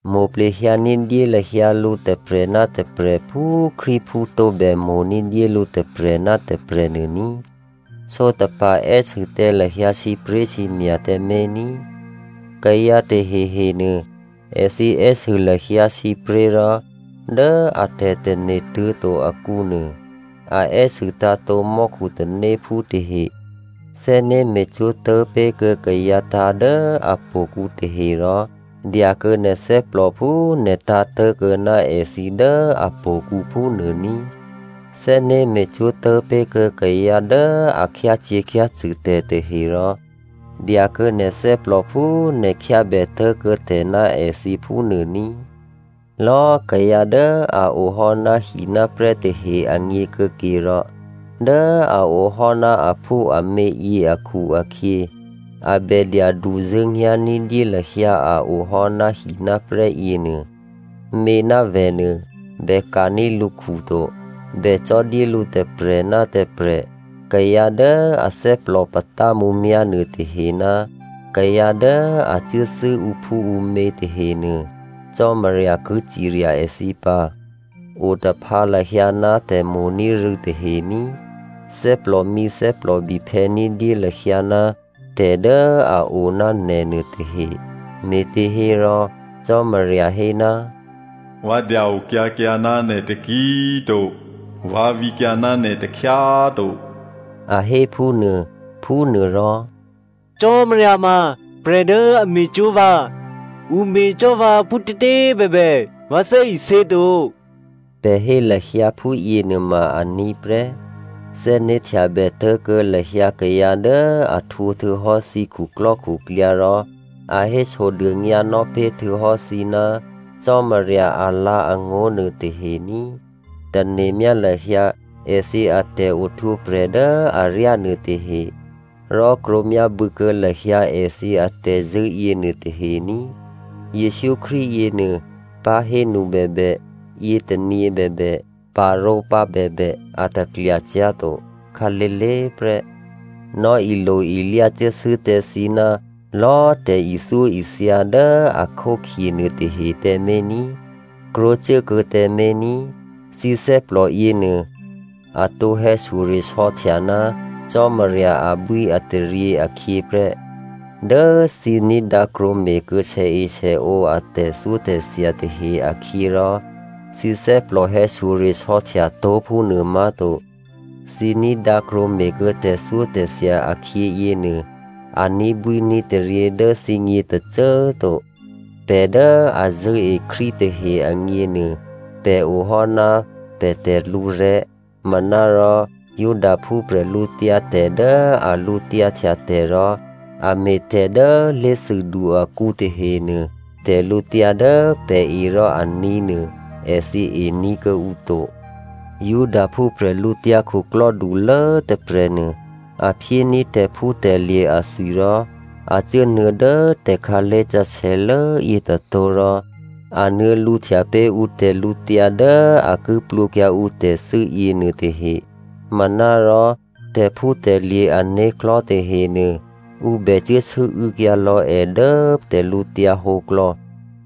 Mo̤plehyǎ ní̤dyé lahyǎ lǔ tôprè̤ ná tôprè̤ phú Krístuphú tǒbè mo̤ ní̤dyé lǔ tôprè̤ ná tôprè̤ nuô ní꤮. Sǒtapa̤ è́sû tǎ lahyǎ sǐpré̤sǐmya̤ tǎmé̤ ní꤮. Kayǎ tahehenuô èthǐ è́sû lahyǎ sǐpré̤ rò dố a tè̤tane̤ tuố̤to akǔnuô, a è́sû tǎ̤tǒ mò́khu tanéphú tahe. Thè́né̤ me̤cwó̤ tố̤pé̤kuô̌ kayǎ tǎ̤ dố htò̌kǔ tahe rò dyakuô̌ nè̤ thè́plò phú nè̤ tǎ̤tố̤kuô̌ ná èthǐ dố htò̌kǔ phúnuô ní꤮. Thè́né̤ me̤cwó̤ tố̤pé̤kuô̌ kayǎ dố a khyácyě̤khyácṳ̂ tè̤ tahe rò dyakuô̌ nè̤ thè́plò phú nè̤ khyábè tố̤kuô̌ tè̤ ná èthǐ phúnuô ní꤮. Lò̌꤮ kayǎ dố a o hò́ náhináprè́ tahe agněkuô̌ke rò, dố a o hò́ ná aphúamě yě akhu-akhyě, a bè dyaduzṳ̂́nyá̤ ní̤dyé lahyǎ a o hò́ ná hináprè́ yěnuô. Mě ná vè̤ nuô bè ka̤ní̤ lǔkhu to, bè cò́ dyé lǔ tôprè̤ ná tôprè̤. Kayǎ dố athè́plò patá mǔmyá̤ nuôtahe ná kayǎ dố a cuốthû́ ǔphúǔmě tahenuô Cò́marya ki cirya èthǐ pǎ. Otaphǎ lahyǎ ná tè̤mo̤ní̤ rû̌ tahe ní꤮. Thè́plòmǐ thè́plòbiphè̌ ní̤dyé lahyǎ ná tè̤ dố a o ná nè̤nuô tahe, me̤těhérò Cò́marya hé, “Vǎ dya-okyǎkyǎ ná nè̤ taki꤮ to, vǎ vǐkyǎ ná nè̤ takhyá꤮ to,” a hé phúnuô. Phúnuôrò, “Cò́marya ma prè̤ dố a me̤cwó̤ vǎ. Ǔ me̤cò́ vǎ phútětě꤮ bèbè, vǎ thè́isě to,” pè̤ hé lahyǎ phúyě nuôma aní̤ prè́. Thè́né̤htyabè tố̤kuô̌ lahyǎ kayǎ dố a htwǒ htuô̌hò́ thǐ khuklò́khuklyǎ rò a hésodônyǎnò́ pé̤ htuô̌hò́ thǐ ná Cò́marya alǎ̤angó̤ nuôtahe ní꤮. Tane̤myá lahyǎ èthǐ atè̤ohtwǒprè̤ dố aryá nuôtahe, rò krwǒmyábû̌ kuô̌ lahyǎ èthǐ atè̤zṳ̂́ yěnuô tahe ní꤮. Jesǔ Krístu yěnuô, pahénu bèbè, yětônyě bèbè, parǒpǎ bèbè, a taklyacyá̤ to, khǎlé̤lé̤ prè́. Nò̌ilo-ilyá cuốthû́ tǎ thǐ ná lò̌꤮ tè̤ithyóithya dố a khókhye nuôtahe tǎmé̤ ní꤮. Krwǒcuốkuô̌ tǎmé̤ ní꤮. Thǐ thè́plò yěnuô, a tǒ hè̌shyoresò̌htya ná Cò́marya abwíataryě akhyě prè́. Dố thǐ ní̤dǎ krwǒme̤kuô̌ sèesèǒ a tè̤thyótè̤thya tahe akhyě rò thǐ thè́plò hè̌shyoresò̌htya tó̤ phúnuô má̤to. Thǐ ní̤dǎ krwǒme̤kuô̌ tè̤thyótè̤thya akhyě yěnuô, a ní̤bwíní̤taryě dố thǐgně tôcô꤮ to. Pè̤ dố a zṳ̂́e Krístu tahe agněnuô, pè̤ o hò́ ná pè̤ tè̤lǔrè̤́. Manárò Judaphú bwídu dố a lǔtyǎhtya tè̤ rò a me̤tè̤ dố lé̤thûdu akǔ tahenuô, tè̤lǔtyǎ dố pè̤ e rò aní̤ nuô èthǐ ení̤ kuô̌ǔ to. Judaphú bwídukhulố tôprè̤nuô, a phyéní̤ tè̤phútè̤lye̤ athwi rò a cuốnuô̌ dố tè̤khǎlé̤ sǎsè̌lố yětôtó̤ rò a nuô̌ lǔhtya pé̤ ǔ tè̤lǔtyǎ dố a ki plwǒkyǎ ǔ tè̤thû́ yěnuôtahe. Manárò tè̤phútè̤lye̤ ané̤klò̤́ tahenuô ǔ bè cuố sû́û̌kyǎ lò̌ è dố tè̤lǔhǒdu klò̌.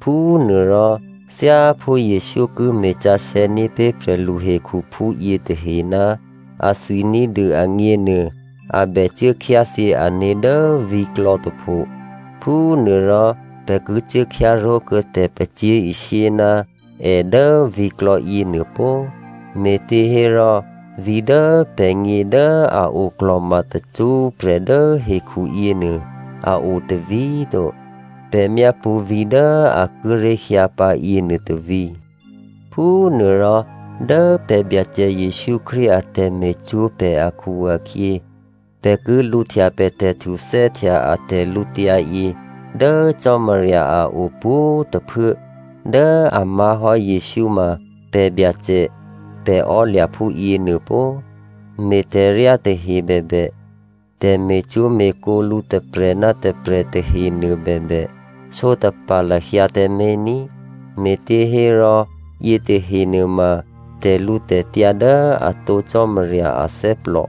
Phúnuôrò thyáphú Jesǔ ki me̤ sǎsè̌ ní̤pé̤ prè̤lu hekhuphú yětahe ná athwi ní̤dû agněnuô a bècuố khyáthyě ané̤ dố vǐ̤klò̌ tôpho. Phúnuôrò pè̤ ki cuố khyáró̤kuô̌ tè̤pacyé̤ishyé ná è dố vǐ̤klò̌ yěnuô pó꤮. Me̤těhérò vǐ̤ dố pè̤gně dố a oklò̤ma tacṳ́prè̤ dố hekhu yěnuô a o tôvǐ̤ to. Pè̤ myápṳ̌ vǐ̤ dố a kíré̤ hyǎ pǎ yěnuô tôvǐ̤. Phúnuôrò, dố pè̤ Byacè Jesǔ Krístu a tè̤me̤cwó̤ pè̤ akhu-akhyě, pè̤ ki lǔhtya pè̤ tè̤htuthè́htya a tè̤lǔtyǎyě dố Cò́marya a o pwǒ̤꤮ tôphuố dố a má̤hò́ Jesǔ ma pè̤ Byacè, pè̤ ò́lya̤ phúyě nuô pó꤮. Me̤tè̤ryá tahe bèbè, tè̤me̤cwó̤me̤kǒ lǔ tôprè̤ ná tôprè̤ tahenuô bèbè sǒtapa̤ lahyǎ tǎmé̤ ní꤮, me̤těhérò yětahe nuôma tè̤lǔtè̤tyǎ dố atǒ Cò́marya athè́plò.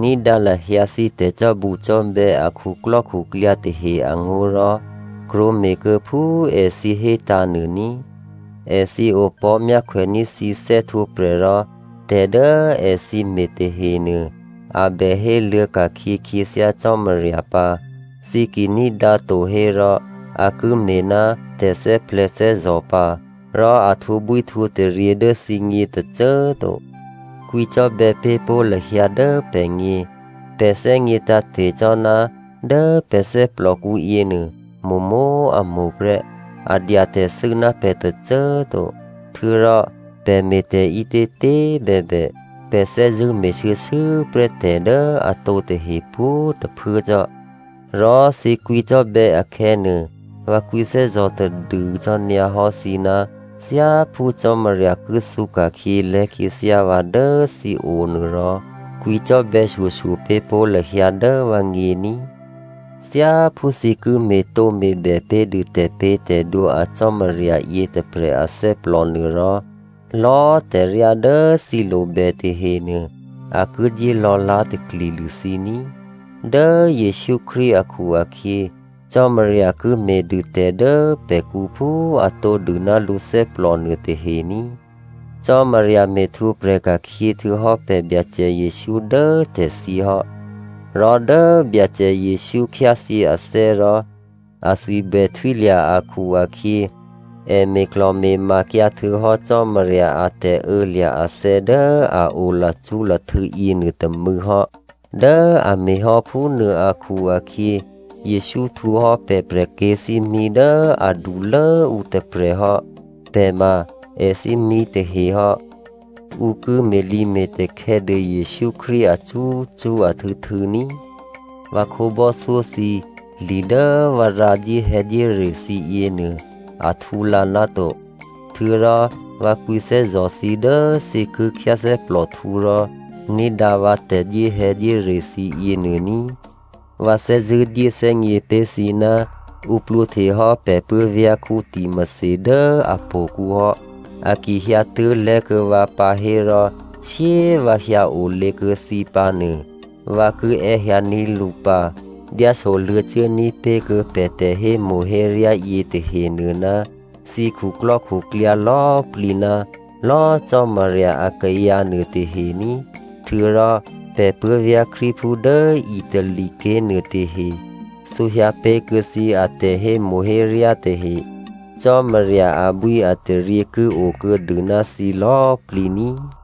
Ní̤dǎ lahyǎ thǐ tè̤cò́bucò́bè̌ a khuklò́khuklyǎ tahe angó̤ rò krwǒme̤kuô̌ phú èthǐ hétǎ̤ nuô ní꤮. Èthǐ opò̤́ myákhwèní̤ thǐ thè́htwǒprè̤ rò tè̤ dố èthǐ me̤ tahenuô, a bè héluô̌ ka̤khyě khyěthyá Cò́marya pǎ. Thǐ ki ní̤dǎ to hérò a ki me̤ ná tè̤thè́plè̤̌thè́zò̤ pǎ. Rò a htwǒbwíhtwǒtaryě dố thǐgně tôcô꤮ to. Kwǐcò́bè̌ pé̤ pó̤ lahyǎ dố pè̤gně. Pè̤ thè́gně tǎ̤te̤ cò́ ná dố pè̤ thè́plòkǔ yěnuô mo̤mo̤꤮ a mo̤ prè́, a dya tè̤thû́ ná pè̤ tôcô꤮ to. Htuô̌rò pè̤ me̤tè̤ ǐtětě꤮ bèbè, pè̤ thè́zṳ̂́ me̤shuô̌shuô̌prè́ tè̤ dố atǒ tahe pwǒ̤꤮ tôphuố cò́. Rò thǐ kwǐcò́bè̌ akhè̌nuô, vǎ kwǐthè́zò̤ tadû cò́ nyǎhò́ thǐ ná thyáphú Cò́marya ki thǔka̤khyě lè̤́khyěthyá vǎ dố thǐo nuôrò, kwǐ cò́bè̌shyoshyo pé̤ pó̤ lahyǎ dố vǎgně ní꤮. Thyáphú thǐ ki me̤tǒme̤bè pé̤dû tè̤pě̤tè̤dwǒ a Cò́marya yětôprè̤ athè́plò nuôrò, lò̌꤮ tè̤ryá dố thǐ lobè tahenuô, a ki dyé lò̌lá̤takli dû thǐ ní꤮. Dố Jesǔ Krístu akhu-akhyě, Cò́marya ki me̤dûtè̤ dố pè̤kǔ phú a tǒdû ná lǔthè́plò nuôtahe ní꤮. Cò́marya me̤htwǒprè̤ ka̤khyě htuô̌hò́ pè̤ Byacè Jesǔ dố tè̤thyě hò́. Rò dố Byacè Jesǔ khyáthyě athè́ rò athwi bè htwílya̤ akhu-akhyě, è me̤klò̤me̤makyǎ htuô̌hò́ Cò́marya a tè̤ô̌lya̤ athè̌ dố a o tacṳ́prè̤ yěnuôtômû̌ hò́. Dố a me̤hò́ phúnuô akhu-akhyě Jesǔ htwǒ hò́ pè̤ prè̤kyě̤thímí dố adulốǔ tôprè̤ hò́. Pè̤ ma èthímí tahe hò́. Ǔ ki me̤lǐme̤takhè̌ dû Jesǔ Krístu acṳ́cṳ́ ahtû̌htû̌ ní꤮. Vǎ khǒbò́thyó thǐ, li dố vǎ rǎ dyéhè̌dyére thǐ yěnuô a htǔlǎ náto. Htuô̌rò vǎ kwǐthè́zò̤ thǐ dố thǐ ki khyáthè́plòhtǔ rò ní̤dǎ vǎ tè̤dyéhè̌dyére thǐ yěnuô ní꤮. Vǎ thè́zṳ̂́ dyéthè́gně pé̤ thǐ ná ǔ plwǒhtehò́ pè̤ puố̤vyá̤ Timothy dố htò̌kǔ hò́. A ki hyǎtuố̤ lè̤́kuô̌ vǎ pǎ hérò shyé꤮ vǎ hyǎ olě kuô̌ thǐ pǎ nuô, vǎ ki è́hyǎní̤ lǔ pǎ. Dyáso luô̌cuố ní̤pé̤kuô̌ pè̤ tè̤hémo̤héryá yětahenuô ná thǐ khuklò́khuklyǎ lò̌꤮ plǐ ná lò̌꤮ Cò́marya akayǎ nuôtahe ní꤮. Htuô̌rò pè̤ puố̤vyá̤ Krístuphú dố Italy ké̤ nuôtahe thǔhyǎ pé̤kuô̌ thǐ atè̤hémo̤héryá tahe. Cò́marya abwíataryě ki okuô̌dû ná thǐ lò̌plǐ ní꤮.